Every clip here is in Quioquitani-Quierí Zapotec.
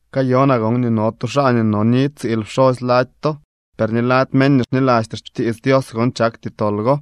Kayonaa gon nii no tu xaa nii noni tsiil pxosy lady to. Per ni lady meñ nii xnilasty xtiits Dios gon chakty tol go.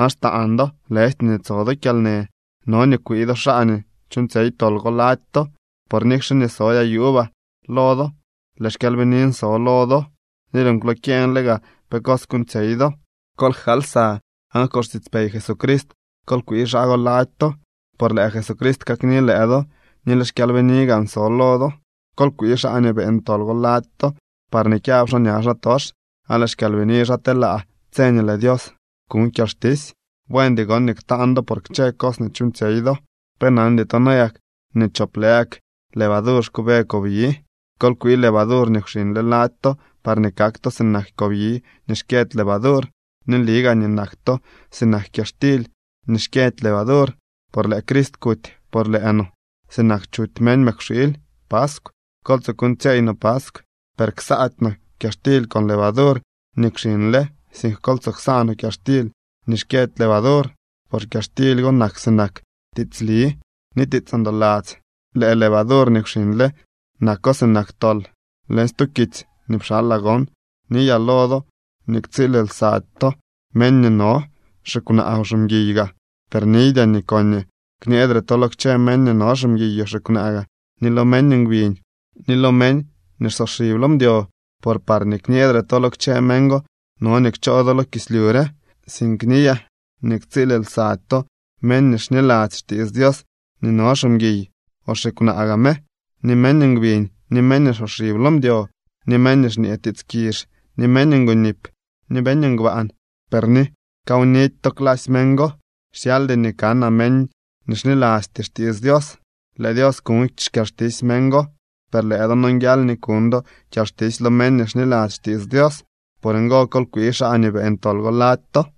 ¡Aan xtaan do, lëjty nii tso do kyalnë! No nii kwii do xaa nii chuuñtsyey tol go lady to. Por nikxe nii sodyaa yuubaa lo do, lëë xkyalbinin so lo do, ni lëën kwlokyeñle gaa pe cos kuuñtsyey do. Kol jkaal lsa aan con xtiitspey Jesucrist kol kwii xaa go lady to, por lëë Jesucrist kakni lëë do, ni lëë xkyalbini gaan so lo do. Kol kwii xaa nii beeñ tol go lady to parñee kyab xaa ña xaatox, aan lëë xkyalbini xaa telaa tse nii lëë Dios kuñ kyalxtisy. Buendy gon nii ktaan do por kchë cos nii chuuñtsyey do. ¿Pe nandy to nayak nii chop lë gak levadur xkuube kobyi? Kol kwii levadur nii kwxiñle lady to parñee kak to sinak kobyi nii xkyëdy levadur. Ni nli gaa nii nak to sinak kyaxtily nii xkyëdy levadur, por lëë Crist kuty por lëë noo sinak nii chuty meñ mëkwxiily paskw. Kol tsoo kuuñtsyeey no paskw, per ksaady no kyaxtily con levadur nii kwxiñle, sink kol tsoo ksaa no kyaxtily nii xkyëdy levadur, por kyaxtily go nak sinak tiitsli ni tiits ndoladzy. Lëë levadur nii kwxiñle nako sinak tol. Leñ stu kitsy nii pxalaa gon niyaa lo do nii ktsiil lsady to meñ nii no xikwnaa o ximguiy gaa. Per niydyaa nii koñee kñeedre to lo kchë meñ nii no ximguiy o xikwnaa gaa, ni lo meñ ngbiñ, ni lo meñ nii xsoxib lo mdyo, por parñee kñeedre to lo kchë meñ go no nii kchoo do lo kislyu re. Sink niyaa nii ktsiil lsady to meñ nii xniladzy xtiits Dios nii no ximguiy o xikwnaa gaa me, ni meñ ngbiñ, ni meñ nii xsoxib lo mdyo, ni meñ nii xñee tiits kizh, ni meñ ngonip, ni meñ ngbaan. Per ni kawnidy to clasy meñ go. Xyaldy nii kanaa meñ nii xnilasty xtiits Dios. Lëë Dios kuñ xkyalxtisy meñ go. Per lëë do nonguial nii kuñ do kyalxtisy lo meñ nii xniladzy xtiits Dios. Por ngo, kol kwii xaa nii beeñ tol go lady to.